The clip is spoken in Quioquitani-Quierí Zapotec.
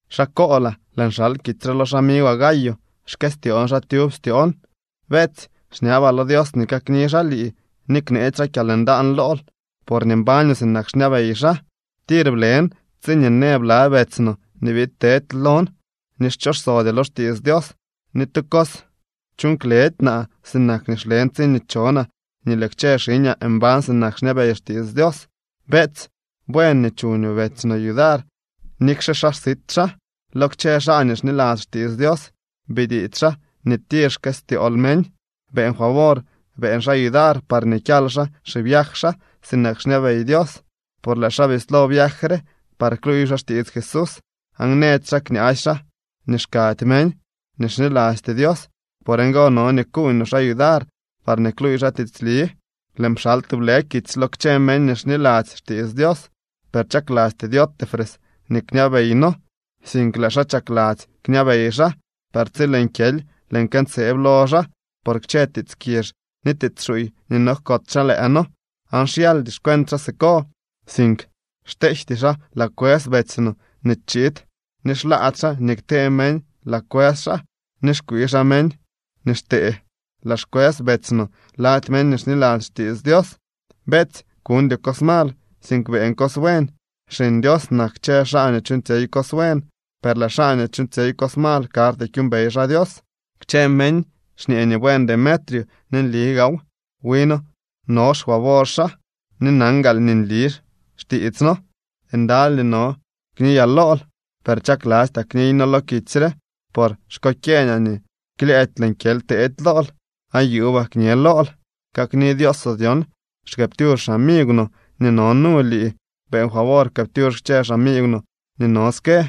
Xaa koolaa. Lëën xal kitsy re lo xamigwaa Gayo. Xkëstyoon xaa tyub styoon. Beetsy, xñabaa lo Dios nii kakni xaa lii ni kneetsy xaa kyalndaan lool porñee mbañoo sinak xñabey xaa. Tir blen tsiñee në bla betsy no nii biid tedy lon nii xchosodyoo lo xtiits Dios. Ni tu cos chuuñ kledy naa sinak nii xlen tsiñee chonaa nii lëë kchë xiñaa mbañ sinak xñabey xtiits Dios. Beetsy, buen nii chuñoo betsy no yudar nikxe xaa sit xaa. Lo kchë xaa nii xniladzy xtiits Dios bitiits xaa nii tir xkëstyool meñ. Beeñ favor beeñ xaa yudar parñee kyal xaa xiviaj xaa sinak xñabey Dios. Por lëë xaa bislo viaj re par kluuy xaa xtiits Jesús, aan nëdy xaa kñaasy xaa nii xkady meñ nii xnilasty Dios. Por ngo no nii kuuñ no xaa yudar parñee kluuy xaa tiitsli. Lëën pxal tublë kitsy lo kchë meñ nii xniladzy xtiits Dios, per chaklasty Diótrefes nii kñabey noo, sink lëë xaa chakladzy kñabey xaa. Per tsi lëën kyely, lëën këntseeb lo xaa por kchë tiits kizh ni tiits xuuy nii nojkots xaa lëë noo. Aan xyaldy xcuent xaa siko, sink xteejty xaa laa kwës betsy no nii chiid, ni xlaady xaa nii ktee meñ laa kwës xaa ni xkwii xaa meñ nii xtee laa xkwës betsy no lady meñ nii xniladzy xtiits Dios. Beetsy, kuñdyoo cos mal, sink beeñ cos buen. Xiñ Dios nak kchë xaa nii chuuñtsyey cos buen, per lëë xaa nii chuuñtsyey cos mal karty kyuumbey xaa Dios. Kchë meñ xñee nii buen Demetrio ni nli gaaw. Wi noo no xfavor xaa ni nan gaal nii nli xtiits noo. Ndaly nii no kniyaa lool, per chaklastyaa kniyno lo kitsy re, por xkokyeeñaa nii klyëëdy lëën kyely teedy lool, aan yuubaa kñe lool. Kakni Dioosoo dyon. Xkëëptyux xamigw no nii no nu lii. Beeñ favor pkëëptyux kchë xamigw no nii no ske.